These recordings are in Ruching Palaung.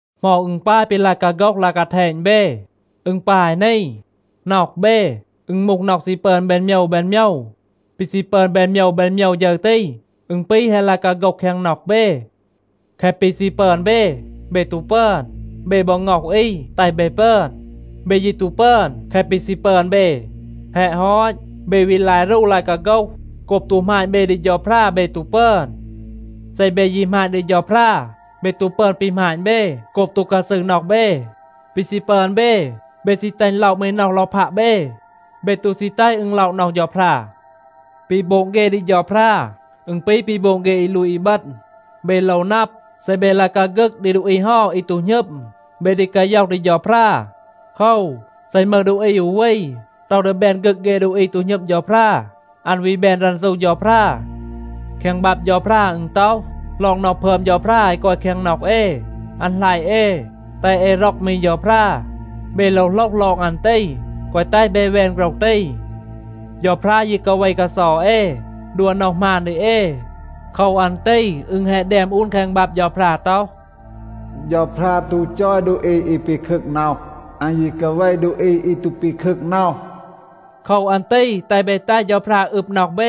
เหมา อึณ ปาย ปี ลาย กาโฆห ลาย กาแทณ เบ? อึณ ปาย นี. น็อห เบ, อึณ มูห น็อห ซี ปึอน แบน โมยว แบน โมยว. ปี ซี ปึอน แบน โมยว แบน โมยว ฌึร ตี, อึณ ปี แฮะ ลาย กาโฆห แคง น็อห เบ. แคะ ปี ซี ปึอน เบ, เบ ตู ปึอน. เบ บอ ง็อห อี, แตห เบ ปึอน. เบ ยี ตู ปึอน แคะ ปี ซี ปึอน เบ. แฮะ ฮอต, เบ วี ลาย รู ลาย กาโฆห. โกบ ตู หมาณ เบ ดี เฌาพรา, เบ ตู ปึอน. เซ เบ ยี หมาณ ดี เฌาพรา, เบ ตู ปึอน ปี หมาณ เบ โกบ ตู กาซืร น็อห เบ. ปี ซี ปึอน เบ, เบ ซี แตห อึณ ล็อะ มี น็อห ลอพัะ เบ. เบ ตู ซี แตห อึณ ล็อะ น็อห เฌาพรา. ปี โบง เฆ ดี เฌาพรา, อึณ ปี ปี โบง เฆ อี ลูต อีบึณ. เบ โลว นับ, เซ เบ ลาย กาฆึก ดี ดูอี เฮา อี ตู หณึม, เบ ดี กาย็อห ดี เฌาพรา. โคว, เซ อึณ มึห ดูอี อู วี, ต็อห ดี แบน ฆึก เฆ ดูอี ตู หณึม เฌาพรา, อัน วี แบน รันซู เฌาพรา. แคง บับ เฌาพรา อึณ ต็อห ลอง น็อห พึอม เฌาพรา อี กอย แคง น็อห เอ, อัน หลัยะ เอ, แตห เอ ร็อก มี เฌาพรา. เบ โลว โหลห ลอง อัน ตี, แกวะ แตห เบ แวน โฆรห ตี. เฌาพรา ยี กาเว กาเซา เอ, ดัว น็อห หมาน ดี เอ. โคว อัน ตี อึณ แฮะ แดม อูน แคง บับ เฌาพรา ต็อห, “เฌาพรา ตู จอย ดูอี อี ปีคึก น็อห. อัน ยี กาเว ดูอี อี ตู ปีคึก น็อห.” โคว อัน ตี แตห เบ แตห เฌาพรา อึบ น็อห เบ.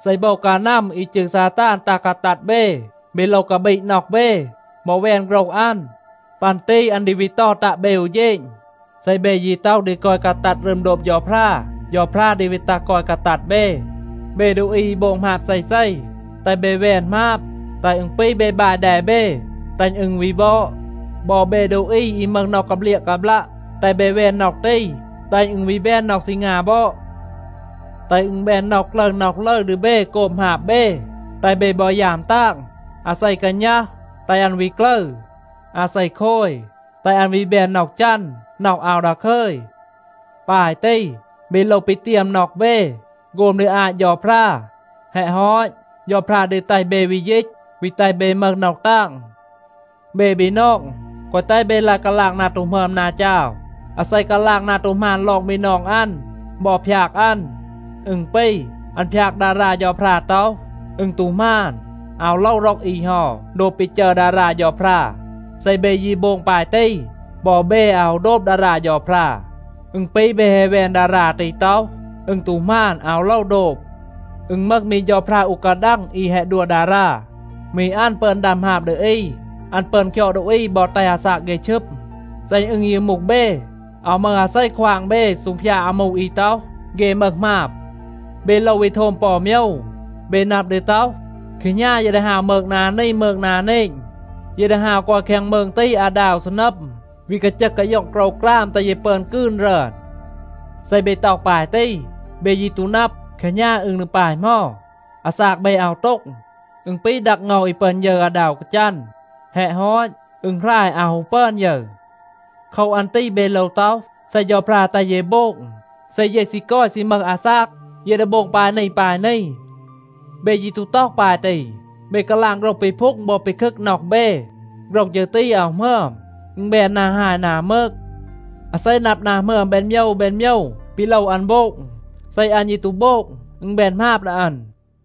เซ โบว กานัม อี จืร ซาตาน ตัห กาตัด เบ, เบ โลว กาบีด น็อห เบ บอ แวน โฆรห อัน. ปัน ตี อัน ดี วี เตา ตัะ เบ อู เฌณ. เซ เบ ยี ต็อห ดี กอย กาตัด รึม โดบ เฌาพรา, เฌาพรา ดี วี ตัห กอย กาตัด เบ. เบ ดูอี อี โบง หมาบ เซเซ, แตห เบ แวน หมาบ, แตห อึณ ปี เบ บาย แด เบ, แตห อึณ วี บอด. บอ เบ ดูอี อี มึห น็อห กาเบลียะ กาบลัะ, แตห เบ แวน น็อห ตี, แตห อึณ วี แบน น็อห ซีงา บอด. แตห อึณ แบน น็อห กลึร น็อห ลึร ดี เบ โกบ หมาบ เบ, แตห เบ บอ ยาม ตาง. อาเซ กาณัห, แตห อัน วี กลึร. อาเซ โคย, แตห อัน วี แบน น็อห จัน, น็อห อาว ดาคึย. ปาย ตี เบ โลว ปีเตียม น็อห เบ, โฆม ดี อาต เฌาพรา. แฮะ ฮอต, เฌาพรา ดี แตห เบ วี ยีต, วี แตห เบ มึห น็อห ตาง. เบ บีนอง, แกวะ แตห เบ ลาย กาลาง นา ตู หมึอม, นา จาว. อาเซ กาลาง นา ตู หมาน ลอง บีนอง อัน บอ พยาก อัน, อึณ ปี, อัน พยาก ดารา เฌาพรา ต็อห, อึณ ตู หมาน, อาว โลว ร็อก อี เฮา โดบ ปี จัร ดารา เฌาพรา. เซ เบ ยี โบง ปาย ตี, บอ เบ อาว ฮู โดบ ดารา เฌาพรา. อึณ ปี เบ แฮะ แวน ดารา ตี ต็อห, อึณ ตู หมาน, อาว โลว โดบ. อึณ มึห มี เฌาพรา อู กาดัง อี แฮะ ดัว ดารา. มี อัน ปึอน ดัม หมาบ ดี อี. อัน ปึอน คยอด ดูอี บอ แตห อาซาก เฆ ชึม. เซ อึณ ยี มูห เบ, อาว มึห อาเซ ควาง เบ ซูงพยาด อามู อี ต็อห, เฆ มึห หมาบ. เบ โลว วี โทม ปอ อู โมยว. เบ นับ ดี ต็อห, “แคหณา เย ดี ฮาว มืง นา นี, มืง นา เนณ. เย ดี ฮาว กอย แคง มืง ตี อาดา อู ซีนัม, วี กาจึห กาย็อง โกรวกราม, แตห เย ปึอน กืน รึอน.” เซ เบ ต็อห ปาย ตี, เบ ยี ตู นับ, แคหณา อึณ ดี ปาย เหมา. อาซาก เบ อาว โต็ง. อึณ ปี ดัก เงา อี ปึอน ยึร อาดา อู กาจัน. แฮะ ฮอต, อึณ หราย, อาว ฮู ปึอน ยึร. โคว อัน ตี เบ โลว ต็อห, “เซ เฌาพรา แตห เย โบง, เซ เย ซี กอย ซี มึห อาซาก, เย ดี โบง ปาย นี ปาย นี.” เบ ยี ตู ต็อห ปาย ตี. เบ กาลาง โฆรห ปีพูง บอ ปีคึก น็อห เบ. โฆรห ฌึร ตี อาว หมึอม, อึณ แบน นา ฮาย นา มืก. อาเซ นับ นา หมึอม แบน โมยว แบน โมยว ปี โลว อัน โบง, เซ อัน ยี ตู โบง, อึณ แบน หมาบ ดี อัน.